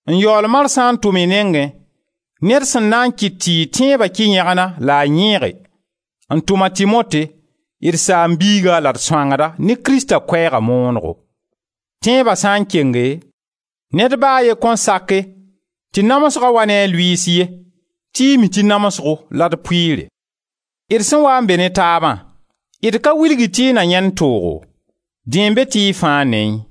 n yaool marsã n tʋm y nengẽ ned sẽn na n kɩt tɩ y tẽeba kɩ yẽgna la a yẽege, n tʋm a Timote, d saam-biiga la d sõangda ne Krista Koɛɛga moonego. Tẽeba sã n kenge, ned ba a ye kõn sake tɩ namsga wa ne a lʋɩɩs ye tɩ y mi tɩ namsgo la d pʋɩɩre. D sẽn waa n be ne taabã, d ka wilg-y tɩ y na yãend toogo. Dẽn n be tɩ y fãa neẽ.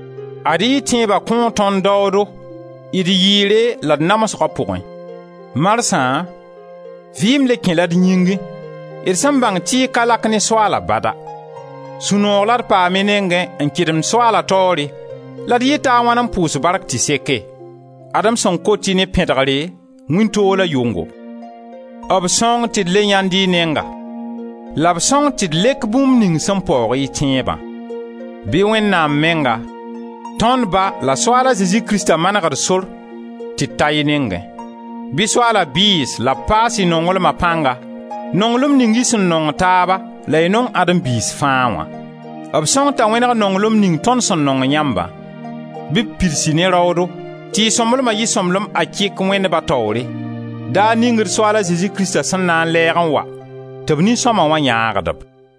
Ad-y y tẽeba kõo tõnd daoodo d yɩɩre la d namsga pʋgẽ. Marsã vɩɩm le kẽ-la d yĩngẽ, d sẽn bãng tɩ y ka lak ne Soaala bada. Sũ-noog la d paam y nengẽ n kɩdemd Soaala taoore la d yɩta a wãn n pʋʋs bark tɩ seke? Ad-m sẽn kot-y ne pẽdegre, wĩntoog la yʋngo: b sõng tɩ d le yãend y nenga la b sõng tɩ d lek bũmb ning sẽn paoog y tẽebã. Bɩ Wẽnnaam menga, tond Ba la Soaal a Zezi Krista maneg d sor tɩ d ta y nengẽ. Bɩ Soaala bɩɩs la b paas y nonglma pãnga, nonglem ning y sẽn nong taaba la y nong Adem biis fãa wã. B sõng t'a wẽneg nonglem ning tõnd sẽn nong yãmbã. Bɩ b pids-y ne raoodo tɩ y sõmblema yɩ sõmblem akɩk Wẽnd Ba taoore, daar ning d Soaal a Zezi Krista sẽn na n lɛɛg n wa tɩ b nin-sõma wã yãagd-b.